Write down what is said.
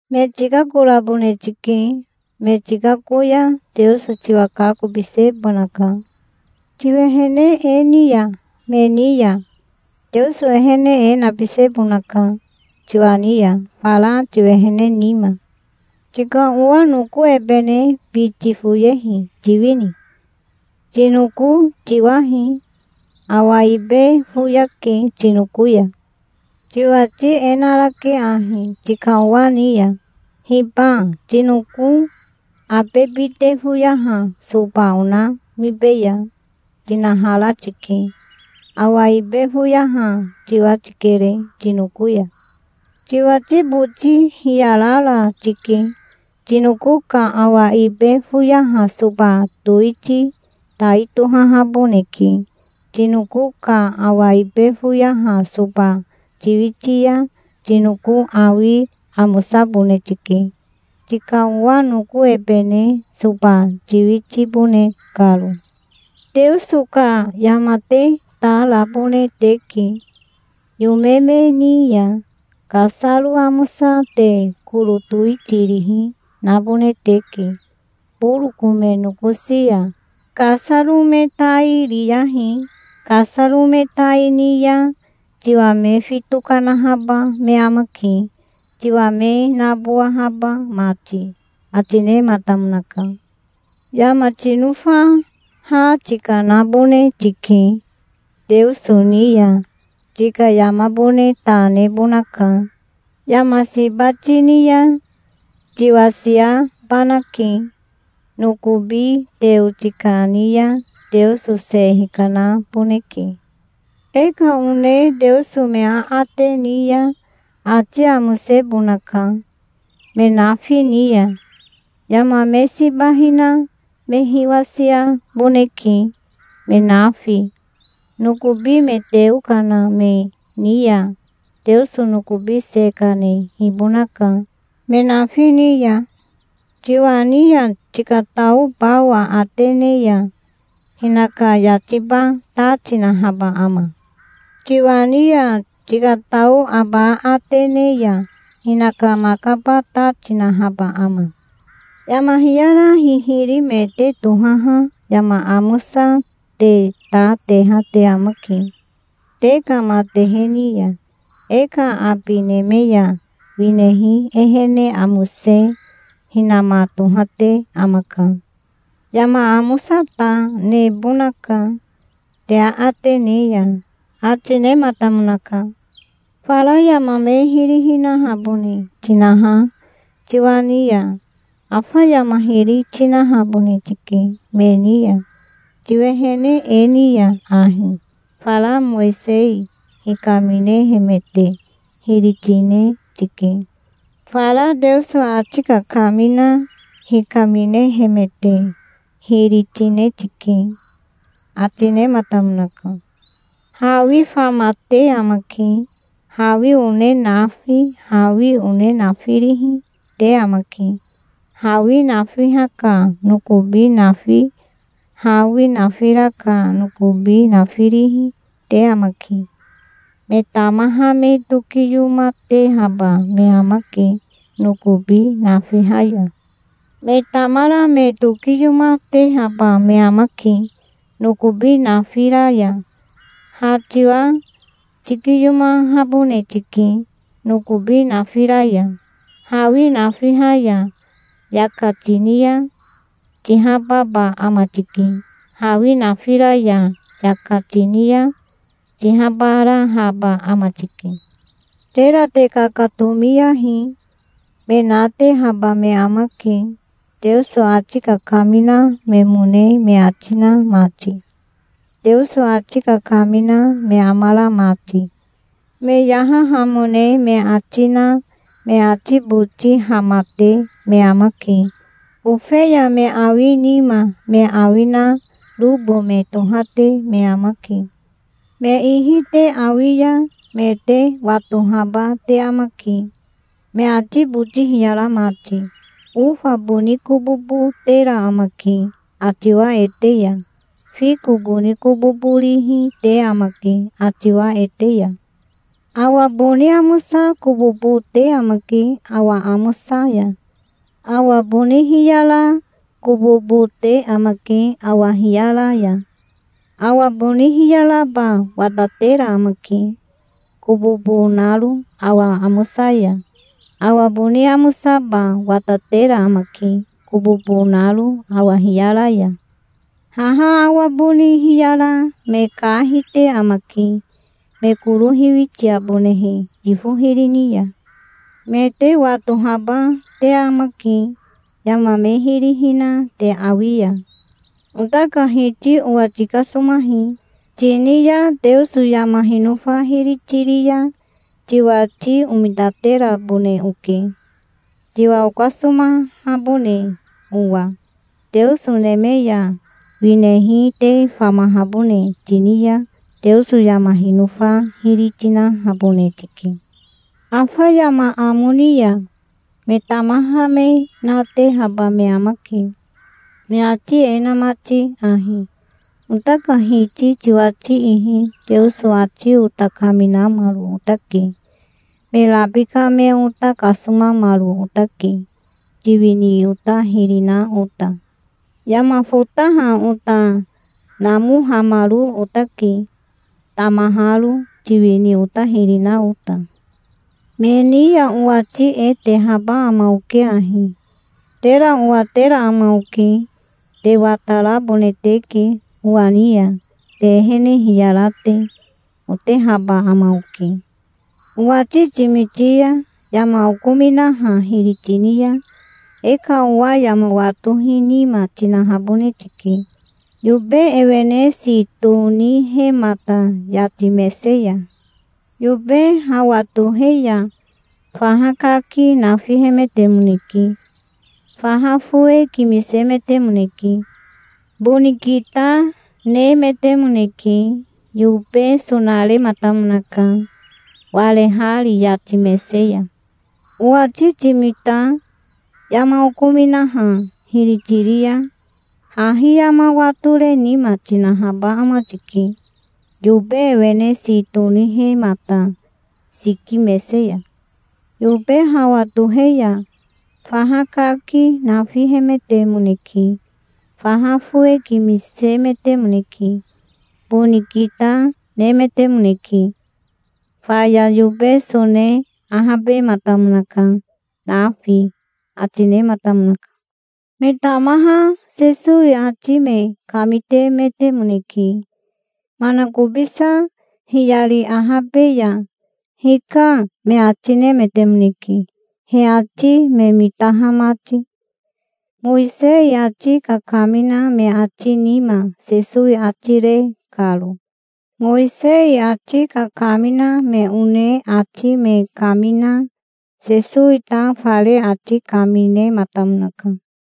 "Me tikakorabone tike. Me tikako ya Teoso tiwa kakobisebonaka. Tiwehene e ni ya me ni ya Teoso ehene e nabisebonaka tiwa ni ya fara tiwehene nima. Tika owa noko ebene biti foyehi tiwini? Tinoko tiwahi. Awa ibe foyake tinoko ya. Tiwati e narake ahi tika owa ni ya: 'Hiba tinoko abe bite foyaha soba onamibeya', tinahara tike. Awa ibe foyaha tiwa tikere tinoko ya. Tiwati boti hiyarara tike. Tinoko ka awa ibe foyaha soba towiti tai tohahaboneke. Tinoko ka awa ibe foyaha soba tiwiti ya tinoko awi amosabone tike, tika owa noko ebene soba tiwitibone karo". "Teoso ka yama te ta rabone teke yome me ni ya. Kasaro amosa te koro towitirihi nabone teke boroko me nokosi ya. Kasaro me tai riyahi. Kasaro me tai ni ya tiwa me fito kanahaba me amake, tiwa me nabowahaba mati", ati nematamonaka. "Yama tinofa ha tikanabone tike Teoso ni ya. Tika yamabone ta nebonaka. Yama siba tini ya tiwasiabanake. Nokobi teo tikani ya Teoso se hikanaboneke. E ka one Teoso me aate ni ya ati amosebonaka me nafi ni ya. Yama me siba hina me hiwasiaboneke, me nafi. Nokobi me teo kana me ni ya Teoso nokobi se kanehibonaka, me nafi ni ya. Tiwa ni ya tikatao bao aate ne ya hinaka yatiba ta tinahaba ama? Tiwa ni ya tikatao aba aate ne ya hinaka makaba ta tinahaba ama? Yama hiyara hihiri me te tohaha yama amosa te ta teha te amake te ka matehe ni ya. E ka abi neme ya winehi ehene amose hinama tohate amaka. Yama amosa ta nebonaka te aate ne ya", ati nematamonaka. "Fara yama me hiri hinahabone tinaha tiwa ni ya, afa yama hiri tinahabone tike me ni ya. Tiwehene e ni ya ahi, fara Mowisei hikaminehemete hiri tine tike. Fara Teoso ati kakamina hikaminehemete hiri, tine tike", ati nematamonaka. "Hawi famate amake. Hawi one nafi, hawi one nafirihi, te amake. Hawi nafiha ka nokobi nafi, hawi nafira ka nokobi nafirihi, te amake. Me tamaha me tokiyomatehaba me amake nokobi nafiha ya. Me tamara me tokiyomatehaba me amake nokobi nafira ya. Ha tiwa tikiyomahabone tike nokobi nafira ya. Hawi nafiha ya yaka tini ya tihababa ama tike. Hawi nafira ya yaka tini ya tihabarahaba ama tike". "Tera te kakatomiyahi. Me natehaba me amake, Teoso ati kakamina memone me ati na mati, Teoso ati kakamina me amara mati. Me yahahamone me ati na me ati boti hamate me amake. Ofeya me awi nima me awi na robo me tohate me amake. Me ihi te awi ya me te watohaba te amake, me ati boti hiyara mati. Ofa boni kobobo tera amake atiwa ete ya. Fiko boni kobobo rihi te amake atiwa ete ya. Awa boni amosa kobobo te amake awa amosa ya. Awa boni hiyara kobobo te amake awa hiyara ya. Awa boni hiyaraba watatera amake, kobobo naro awa amosa ya. Awa boni amosaba watatera amake, kobobo naro awa hiyara ya. Haha awa boni hiyara me ka hite amake, me koro hiwitiabonehe yifo hiri ni ya. Me te watohaba te amake, yama me hiri hina te awi ya". "'Ota ka Hiti owa tikasomahi', tini ya Teoso yama hinofa hiri tiri ya tiwati omitaterabone oke, tiwa okasomahabone owa. Teoso neme ya winehi te famahabone tini ya Teoso yama hinofa hiri tinahabone tike. Afa yama amo ni ya me tamaha me natehaba me amake, me ati e na mati ahi: 'Ota ka Hiti tiwati ihi Teoso ati ota kaminamaro otake. Me rabika me ota kasomamaro otake, tiwini ota hiri na ota. Yama fotaha ota namohamaro otake, tamaharo, tiwini ota hiri na ota'. Me ni ya owati e tehaba ama oke ahi. 'Tera owatera ama oke. Te watarabone teke owa ni ya, te ehene hiyara te', otehaba ama oke". "Owati timiti ya yama okominaha hiri tini ya e ka owa yama watohi nima tinahabone tike, yobe ewene si tonihemata yati mese ya. Yobe hawa tohe ya faha kaki nafihemetemoneke. Faha fowe kimisemetemoneke. Boni kita nemetemoneke. Yobe sonarematamonaka, warehari yati mese ya". "Owati timita yama okominaha hiri tiri ya hahi yama watore nima tinahaba ama tike, yobe ewene si tonihemata siki mese ya. Yobe hawa tohe ya faha kaki nafihemetemoneke. Faha fowe kimisemetemoneke. Boni kita nemetemoneke. Faya yobe sone ahabematamonaka nafi", ati nematamonaka. Me tamaha Sesowi ati me kamitemetemoneke. Manakobisa hiyari ahabe ya 'Hika', me ati nemetemoneke, he ati me mitaha mati, Mowisei ati kakamina me ati nima Sesowi ati re karo. Mowisei ati kakamina me one ati me kamina Sesowi ta fare ati kaminematamonaka.